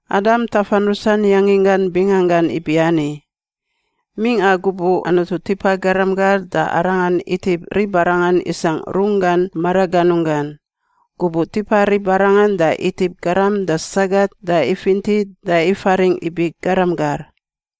Adam tafan rusan yanginggan binganggan ibiani. Mingꞌa gubuꞌ Anutu tipa garam gar da Arangan itip ribarangan isangꞌ Runggan maraganunggan. Gubuꞌ tipa ribarangan da itip garam da sagat da ifinti da ifaringꞌ ibi “garam gar.”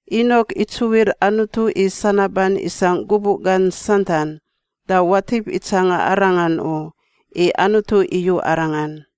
Inok itsuwir Anutu i sanaban isangꞌ gubuꞌ gan santan, da watip itsanga arangan u, i Anutu iyu arangan.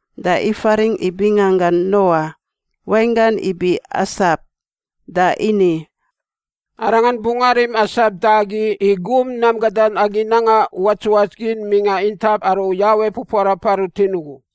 Da ifaringꞌ i binganggan Noa (wainggan ibi asap) da ini, “Arangan bungꞌ arim asap da agi i gum nam gadan agi nanga uwats uwats gin mingꞌa intap aru Yawe pupuarapa rutin ugu.”